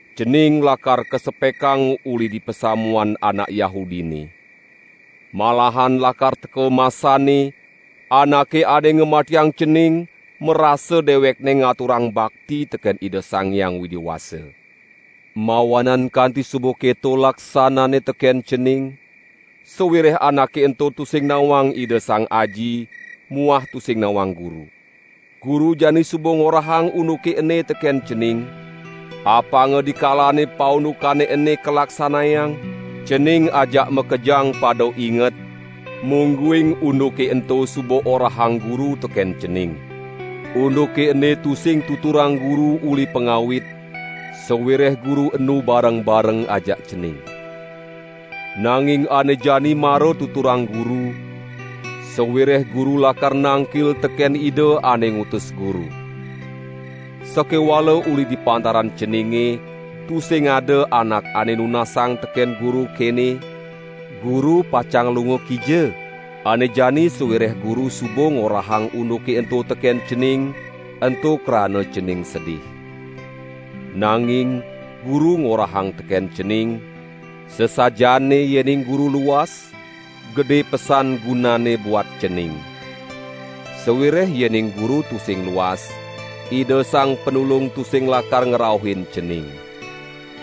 Cening lakar kasepekang uli di pasamuan anak Yahudine. Malahan lakar teka masanne, anake ane ngamatiang cening, marasa dewekne ngaturang bakti teken Ida Sang Hyang Widi Wasa. Mawanan kanti suba keto laksananne teken cening, sawireh anake ento tusing nawang Ida Sang Aji muah tusing nawang Guru. Guru jani suba ngorahang unduke ene teken cening, apanga dikalane paundukane ene kalaksanayang, cening ajak makejang pada inget, mungguing unduke ento suba orahang Guru teken cening." "Unduke ene tusing tuturang Guru uli pangawit, sawireh Guru enu bareng-bareng ajak cening. Nanging ane jani mara tuturang Guru, sawireh Guru lakar nangkil teken Ida ane ngutus Guru. Sakewala uli di pantaran ceninge tusing ada anak ane nunasang teken Guru kene: 'Guru pacang lunga kija?' Ane jani sawireh Guru suba ngorahang unduke ento teken cening ento krana cening sedih. Nanging Guru ngorahang teken cening: Sasajaane yening Guru luas, gede pesan gunanne buat cening; sawireh yening Guru tusing luas, Ida Sang Panulung tusing lakar ngrauhin cening.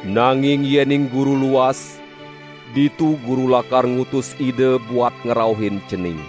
Nanging yening Guru luas, ditu Guru lakar ngutus Ida buat ngrauhin cening.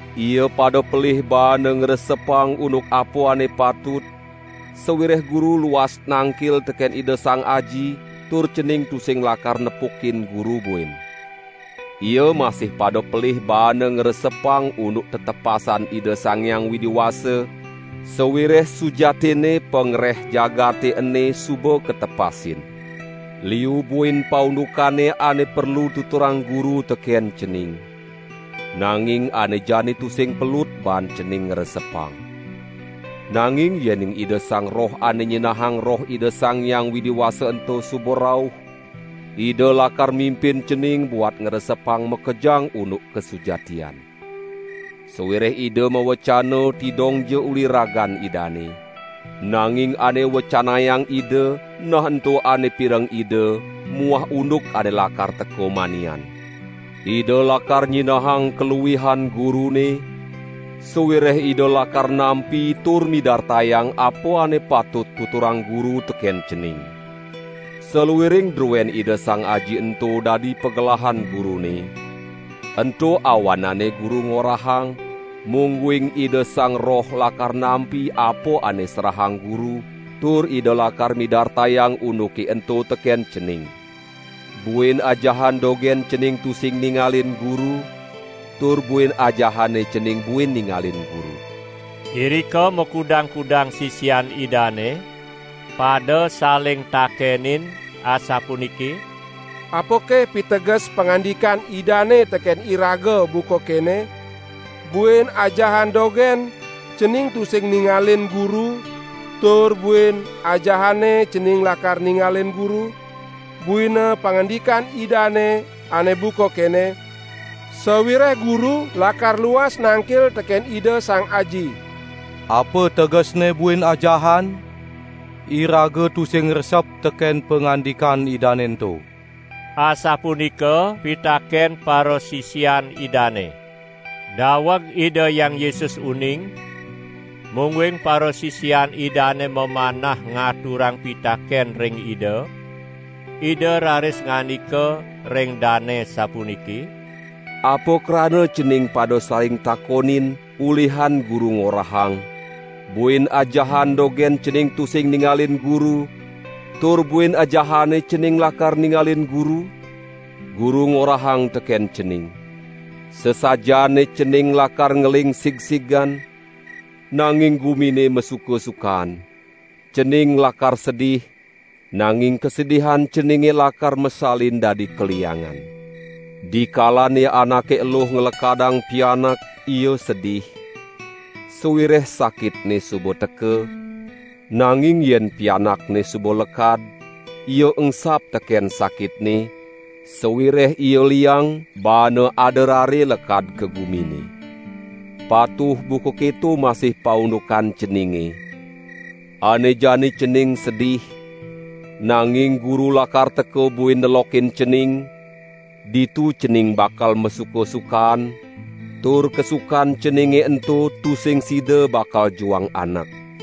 Ia pada pelih baana ngresepang unduk apa ane patut, sawireh Guru luas nangkil teken Ida Sang Aji tur cening tusing lakar nepukin Guru buin. Ia masih pada pelih baana ngresepang unduk tetepasan Ida Sang Hyang Widi Wasa, sawireh sujatinne pangreh jagate ene suba katepasin. Liu buin paundukane ane perlu tuturang Guru teken cening, nanging ane jani tusing pelut baan cening ngresepang. Nanging yening Ida Sang Roh ane nyinahang Roh Ida Sang Hyang Widi Wasa ento suba rauh, Ida lakar mimpin cening buat ngresepang makejang unduk kasujatian. Sawireh Ida mawecana tidongja uli ragan Idane, nanging ane wecanayang Ida nah ento ane pireng Ida muah unduk ane lakar teka manian. Ida lakar nyinahang kaluihan Gurune, sawireh Ida lakar nampi tur midartayang apa ane patut tuturang Guru teken cening. Saluiring druen Ida Sang Aji ento dadi pagelahan Gurune; ento awanane Guru ngorahang, mungguing Ida Sang Roh lakar nampi apa ane serahang Guru tur Ida lakar midartayang unduke ento teken cening." "Buin ajahan dogen cening tusing ningalin Guru tur buin ajahane cening buin ningalin Guru." Irika makudang-kudang sisian Idane, pada saling takenin asapuniki: "Apake piteges pangandikan Idane teken iraga buka kene: 'Buin ajahan dogen cening tusing ningalin Guru tur buin ajahane cening lakar ningalin Guru'? Buina pangandikan Idane ane buka kene: 'Sawireh Guru lakar luas nangkil teken Ida Sang Aji.' Apa tegesne buin ajahan? Iraga tusing resep teken pangandikan Idane ento!" Asapunika pitaken parasisian Idane. Daweg Ida Hyang Yesus uning, mungguing parasisian Idane mamanah ngaturang pitaken ring Ida, Ida raris ngandika ring dane sapuniki: "Apa krana cening pada saling takonin, ulihan Guru ngorahang: 'Buin ajahan dogen cening tusing ningalin Guru tur buin ajahane cening lakar ningalin Guru'? Guru ngorahang teken cening: Sasajaane cening lakar ngeling sigsigan, nanging gumine masuka-sukaan; cening lakar sedih, nanging kasedihan ceninge lakar masalin dadi kaliangan. Dikalane anake eluh nglekadang pianak ia sedih, sawireh sakitne suba teka, nanging yen pianakne suba lekad, ia engsap teken sakitne, sawireh ia liang baane ada rare lekad ka gumine. Patuh buka keto masih paundukan ceninge: Ane jani cening sedih, nanging Guru lakar teka buin nelokin cening, ditu cening bakal masuka-sukaan tur kasukan ceninge ento tusing sida bakal juang anak.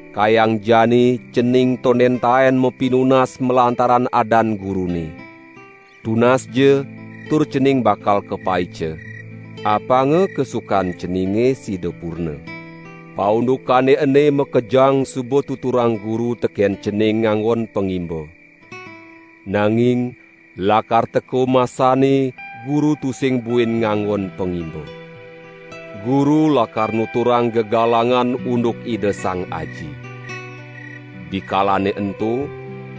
Kayang jani cening tonden taen mapinunas malantaran adan Gurune; tunasja tur cening bakal kapaica, apanga kasukan ceninge sida purna!" "Paundukane ene makejang suba tuturang Guru teken cening nganggon pangimba. Nanging lakar teka masanne Guru tusing buin nganggon pangimba. Guru lakar nuturang gegalangan unduk Ida Sang Aji. Dikalane ento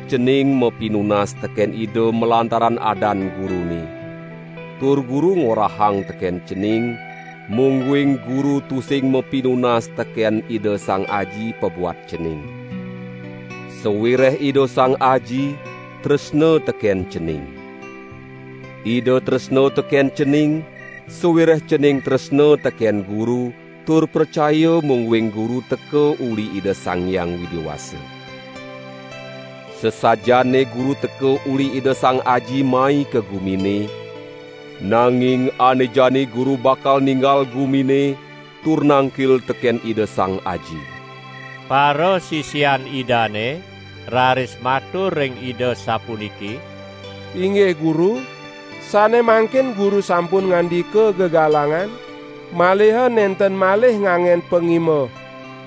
cening mapinunas teken Ida malantaran adan Gurune; tur Guru ngorahang teken cening, mungguing Guru tusing mapinunas teken Ida Sang Aji pabuat cening. Sawireh Ida Sang Aji, tresna teken cening. Ida tresna teken cening, sawireh cening tresna teken Guru tur pracaya mungguing Guru teka uli Ida Sang Hyang Widi Wasa. Sasajaane Guru teka uli Ida Sang Aji mai ka gumine, nanging ane jani Guru bakal ninggal gumine tur nangkil teken Ida Sang Aji." Parasisian Idane raris matur ring Ida sapuniki: "Inggih Guru, sane mangkin Guru sampun ngandika gegalangan maliha nenten malih nganggen pangimba.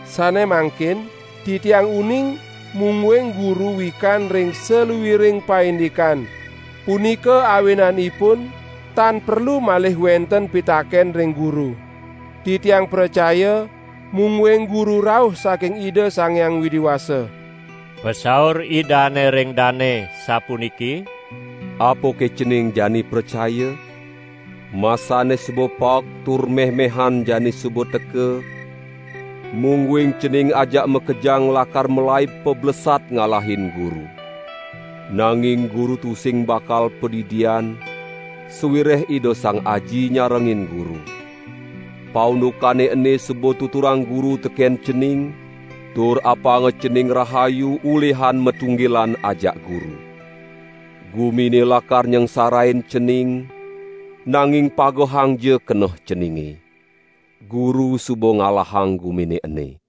Sane mangkin titiang uning mungguing Guru wikan ring saluiring paindikan. Punika awinanipun tan perlu malih wenten pitaken ring Guru. Titiang pracaya mungguing Guru rauh saking Ida Sang Hyang Widi Wasa." Pasaur Idane ring dane sapuniki: "Apake cening jani pracaya? Masanne suba paek tur meh-mehan jani suba teka, mungguing cening ajak makejang lakar malaib pablesat ngalahin Guru. Nanging Guru tusing bakal padidian, sawireh Ida Sang Aji nyarengin Guru. Paundukane ene suba tuturang Guru teken cening, tur apanga cening rahayu ulihan matunggilan ajak Guru. Gumine lakar nyangsarain cening, nanging pagehangja keneh ceninge! Guru suba ngalahang gumine ene!"